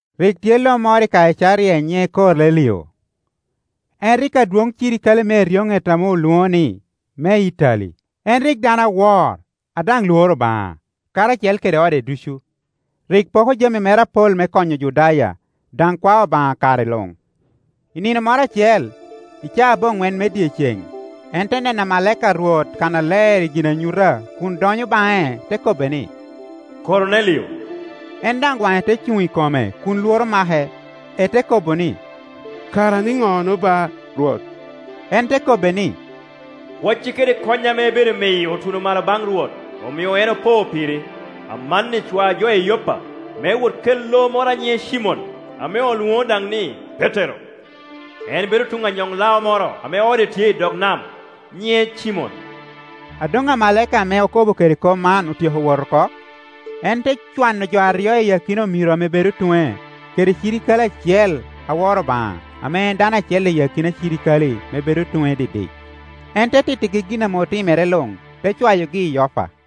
Rik tye lo moro i Kaicaria nyiŋe Komelio, en rik adwoŋ cirikale me eryoŋet ame olwoŋo ni, me Itali. En rik dano awor, a daŋ lworo Obaŋa karacel kede ode ducu; rik poko jami mere apol me konyo Ojudaya, daŋ kwao Obaŋa kare luŋ. I nino moro acel i caa aboŋwen me dyeceŋ, en te neno amalaika a Rwot kannaler i ginanyuta kun donyo baŋe te kobbe ni, “Komelio.” En daŋ waŋe te cuŋ i kome kun lworo amake, ete kobo ni, “Kara ninono ba, Rwot?” En te kobbe ni, “Kwaeci kede kony ame ibedo miyo otuno malo baŋ Rwot, omio en opo piri. Amanni cwa jo i Yoppa me wot kel lo moro a nyiŋe Cimon, ame olwoŋo daŋ ni Petero. En bedo tuŋ anyoŋlao moro ame ode tye i dog nam, nyiŋe Cimon.” A doŋ amalaika ame okobo kede kop man otyeko wot oko, en te cwano jo aryo i akina omiro ame bedo tuŋe, kede cirikale acel a woro Obaŋa ame en dano acel i akina cirikale ame bedo tuŋe didik. En te tittigi gin ame otimere luŋ, te cwayogi i Yopa.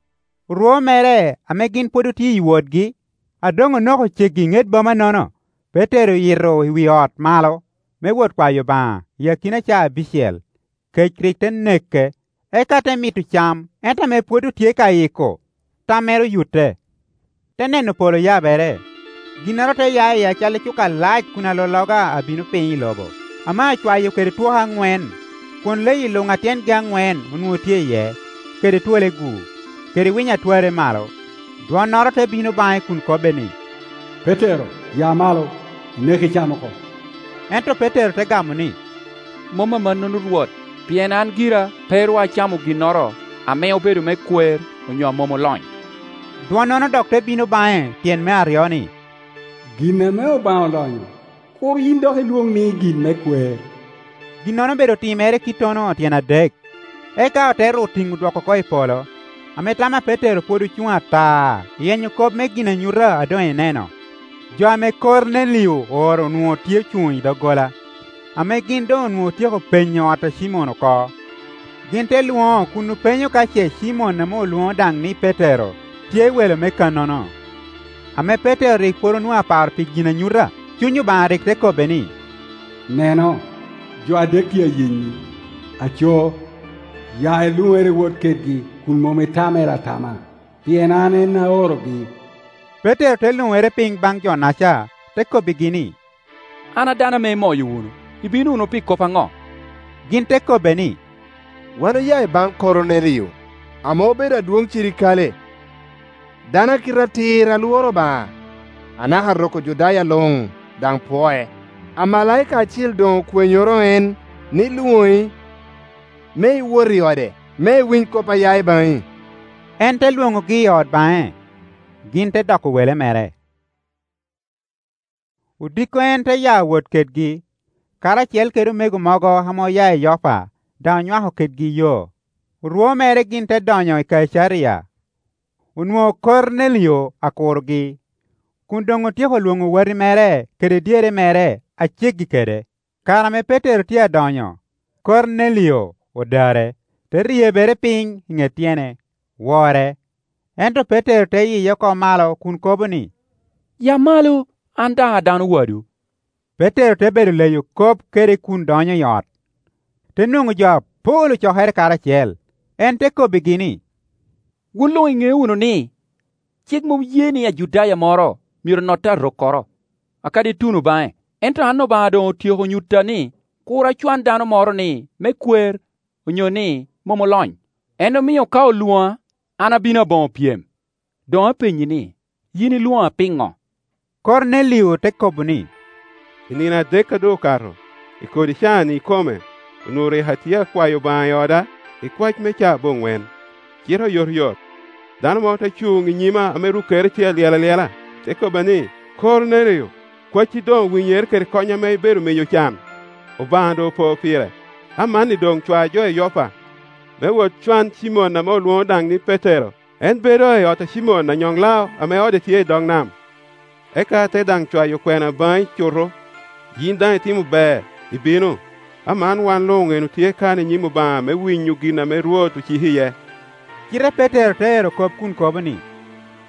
Orwo mere ame gin pwod otye i wotgi, a doŋonoko ceggi i ŋet bomanono, Petero oyito i wi ot malo me wot kwayo Obaŋa i akina caa abicel. Kec rik te neke, eka te mito cam; ento ame pwod otye ka yiko, tammere oyutte, te neno polo oyabere, ginnoro te ya iye acalli cuka alac kun alologa abino piny i lobo, ame acwayo kede twoke aŋwen. Kwon leyi luŋ a tyengi aŋwen onwoŋo tye iye, kede twolegu, kede winy a twarre malo. Dwonnoro te bino baŋe kun kobbe ni, “Petero, ya malo, inek, icam oko.” Ento Petero te gamo ni, “Mom amannono Rwot, pien an gira pe ru acamo ginnoro ame obedo me kwer onyo a mom olony.” Dwonnono dok te bino baŋe tyen me aryo ni, “Gin ame Obaŋa olonyo, kur yin dok ilwoŋ ni gin me kwer.” Ginnono obedo timere kittono tyen adek, eka ote ru tiŋo dwoko oko i polo. Ame tam a Petero pwod ocuŋ ata iyenyo kop me ginanyuta a doŋ eneno, jo ame Komelio ooro onwoŋo tye ocuŋ i doggola, ame gin doŋonwoŋo otyeko penyo ot a Cimon oko. Gin te lwoŋo kun openyo ka ce Cimon ame olwoŋo daŋ ni Petero tye welo me kannono. Ame Petero rik pwod onwoŋo aparo pi ginanyuta, Cuny Obaŋa rik te kobbe ni, “Neno, jo adek tye ayenyi. Aco, ya iluŋere iwot kedgi kun mom itamere ata ma, pien an en aorogi.” Petero te luŋere piny baŋ jo-naca, te kobbigi ni, “An a dano ame imoyo wunu; ibino wunu pi kop aŋo?” Gin te kobbe ni, “Wan oya i baŋ Komelio, ame obedo adwoŋ cirikale, dano a kite atir a lworo Obaŋa, anaka rok me Ojudaya luŋ daŋ pwoe. Amalaika acil doŋ okwenyoro en ni lwoŋi, me iwot i ode, me en winy kop a ya i baŋi.” En te lwoŋogi i ot baŋe, gin te doko wele mere. Odiko en te ya wot kedgi, karacel kede omego mogo ame oya i Yoppa daŋ onywako kedgi yo. Orwo mere gin te donyo i Kaicaria. Onwoŋo Komelio akurogi, kun doŋ otyeko lwoŋo wati mere kede dyere mere a ceggi kede. Kare ame Petero tye a donyo, Komelio odare, te ryebere piny i ŋet tyene, wore. Ento Petero te yiye oko malo kun kobo ni, “Ya malo, an daŋ a dano wadwu.” Petero te bedo leyo kop kede kun donyo i ot, te nwoŋo jo apol ocokere karacel. En te kobbigi ni, “Wun luŋ iŋeo wunu ni, cik mom ye ni Ajudaya moro myero notte arokkoro, akadi tuno baŋe; ento an Obaŋa doŋ otyeko nyutta ni kur acwan dano moro ni me kwer onyo ni mom olony. En omio ka olwoŋa, an abino aboŋo pyem. Doŋ apenyi ni, yin ilwoŋa pino?” Komelio te kobo ni, “I nino adek a doŋ okato, i kodi caa-ni i kome, onwoŋo rik atye akwayo Obaŋa i oda i kwac me caa aboŋwen; cite oyotoyot, dano moro te cuŋ i nyima ame rukkere tye alyel alyela. Te kobba ni, ‘Komelio, kwacci doŋ owinyere kede kony ame i bedo miyo ocan Obaŋa doŋopo pire. Amanni doŋcwajo i Yoppa, me wot cwan Cimon ame olwoŋo daŋ ni Petero; en bedo i ot a Cimon anyoŋ-lao ame ode tye i dog nam.’ Eka ate daŋ cwayo kwena baŋi cuto, yin daŋ itimo ber, ibino. Aman wan luŋ en otye kan i nyim Obaŋa me winyo gin ame Rwot ociki iye.” Cite Petero te ero kop kun kobo ni,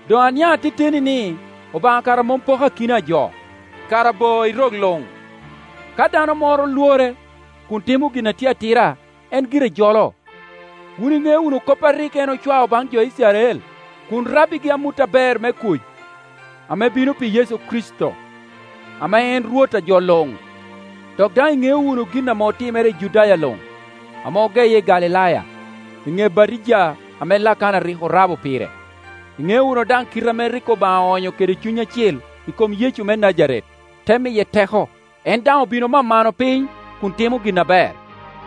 “Doŋ aniaŋ ateteni ni Obaŋa kara mom poko akina a jo. Kara bo i rok luŋ, ka dano moro lwore, kun timo gin a tye atira, en gire jolo. Wun iŋeo wunu kop a rik en ocwao baŋ jo Icrael, kun rabbigi amut aber me kuc ame bino pi Yecu Kricito, ame en Rwot a jo luŋ. Dok daŋ iŋeo wunu gin ame otimere i Judaya luŋ, ame ogeye i Galilaya, i ŋe batija ame Lakana rik orabo pire. Iŋeo wunu daŋ kite ame rik Obaŋa oonyo kede Cuny Acil i kom Yecu me Najaret, te miye teko. En daŋ obin omamano piny kun timo gin aber,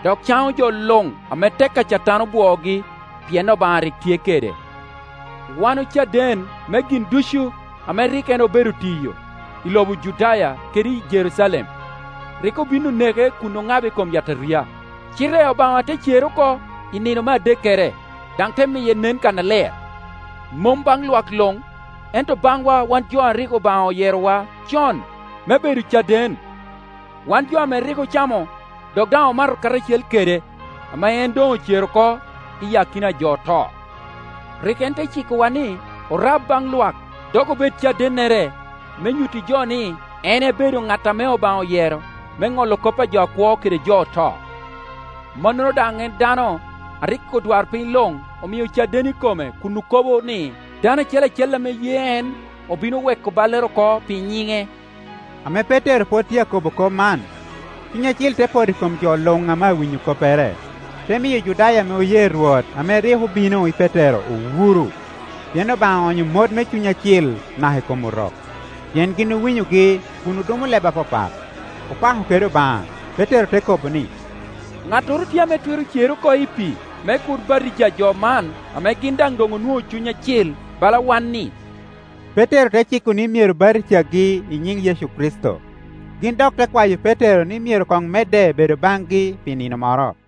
dok caŋo jo luŋ ame tek a Catan obwoogi, pien Obaŋa rik tye kede. Wan ocaden me gin ducu ame rik en obedo tiyo i lobo Judaya kede i Jerucalem. Rik obin oneke kun oŋabe i kom yataria. Cite Obaŋa te cere oko i nino me adekkere, daŋ te miye nen kannaler; mom baŋ lwak luŋ, ento baŋwa wan jo a rik Obaŋa oyerowa con me bedo caden, wan jo ame rik ocamo dok daŋ omato karacel kede, ame en doŋ ocer oko iyi akina a jo oto. Rik en te cikowa ni orab baŋ lwak dok obed cadennere me nyutti jo ni en ebedo ŋat ame Obaŋa oyero me ŋolo kop a jo akwo kede jo oto. Mannono daŋ en dano a rik odwarpiny luŋ omio caden i kome kun okobo ni, dano acel acel ame ye en obino weko ballere oko pi nyiŋe.” Ame Petero pwod tye a kobo kop man. Cuny Acil te poto i kom jo luŋ ame awinyo koppere. Te miyo Ojudaya ame oye Rwot ame rik obino i Petero owuro, pien Obaŋa oonyo mot me Cuny Acil naka i kom Orok. Pien gin owinyogi kun odumo leb apapat, opako kede Obaŋa. Petero te kobo ni, “Ŋattoro tye ame twero cerre oko i pii, me kur batija jo man ame gin daŋ doŋ onwoŋo Cuny Acil bala wan-ni?” Petero te ciko ni myero batijagi i nyiŋ Yecu Kricito. Gin dok te kwayo Petero ni myero koŋ medde bedo baŋgi pi nino moro.